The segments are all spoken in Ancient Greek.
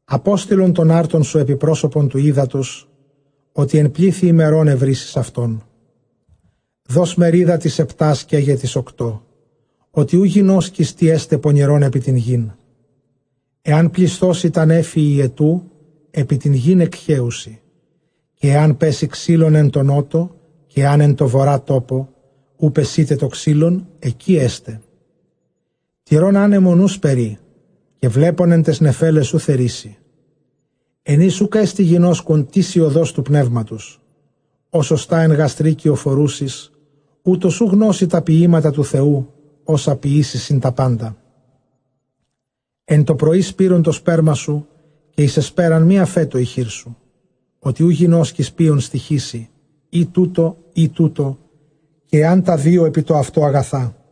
Ἀπόστειλον τὸν ἄρτον σου ἐπὶ πρόσωπον τοῦ ὕδατος, ὅτι ἐν πλήθει ἡμερῶν εὑρήσεις αὐτόν. Δὸς μερίδα τοῖς ἑπτὰ, καί γε τοῖς ὀκτὼ, ὅτι οὐ γινώσκεις τί ἔσται πονηρὸν ἐπὶ τὴν γῆν. Ἐὰν πλησθῶσι τὰ νέφη ὑετοῦ, ἐπὶ τὴν γῆν ἐκχέουσι· καὶ ἐὰν πέσῃ ξύλον ἐν τῷ Νότῳ, καὶ ἐὰν ἐν τῷ Βοῤῥᾷ, τόπῳ οὗ πεσεῖται τὸ ξυλον, ἐκεῖ ἔσται. Τηρῶν ἄνεμον οὐ σπείρει, καὶ βλέπων ἐν ταῖς νεφέλαις οὐ θερίσει. Ἐν οἷς οὐκ ἔστι γινώσκων τίς ἡ ὁδὸς τοῦ πνεύματος, ὡς ὀστᾶ ἐν γαστρὶ κυοφορούσης, οὕτως οὐ γνώσῃ τὰ ποιήματα τοῦ Θεοῦ, ὅσα ποιήσει τὰ σύμπαντα. Ἐν τῷ πρωῒ σπεῖρον τὸ σπέρμα σου, καὶ ἐν ἑσπέρᾳ μὴ ἀφέτω ἡ χείρ σου, ὅτι οὐ γινώσκεις ποῖον στοιχήσει, ἢ τοῦτο ἢ τοῦτο, καὶ ἐὰν τὰ δύο ἐπιτοαυτὸ ἀγαθά.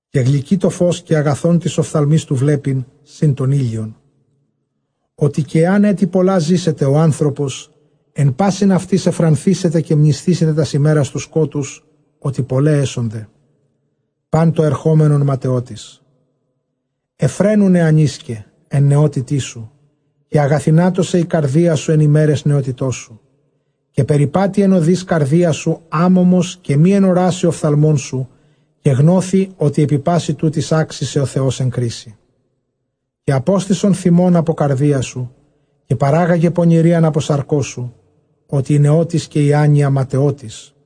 Καὶ γλυκὺ τὸ φῶς, καὶ ἀγαθὸν τοῖς ὀφθαλμοῖς τοῦ βλέπειν σὺν τὸν ἥλιον. Ὅτ καὶ ἐὰν ἔτη πολλὰ ζήσεται ὁ ἄνθρωπος, ἐν πᾶσιν αὐτοῖς εὐφρανθήσεται καὶ μνησθήσεται τὰς ἡμέρας τοῦ σκότους, ὅτι πολλαὶ ἔσονται· πᾶν τὸ ἐρχόμενον ματαιότης. Εὐφραίνου νεανίσκε ἐν νεότητί σου, καὶ ἀγαθυνάτω σε ἡ καρδία σου ἐν ἡμέραις νεότητός σου, καὶ περιπάτει ἐν ὁδοῖς καρδίας σου ἄμωμος, καὶ μὴ ἐν ὁράσει ὀφθαλμῶν σου· καὶ γνῶθι ὅτι ἐπὶ πᾶσι τούτοις ἄξει σε ὁ Θεὸς ἐν κρίσει. Καὶ ἀπόστησον θυμὸν ἀπὸ καρδίας σου, καὶ πάραγε πονηρίαν ἀπὸ σαρκός σου, ὅτι ἡ νεότης καὶ ἡ ἄνοια ματαιότης.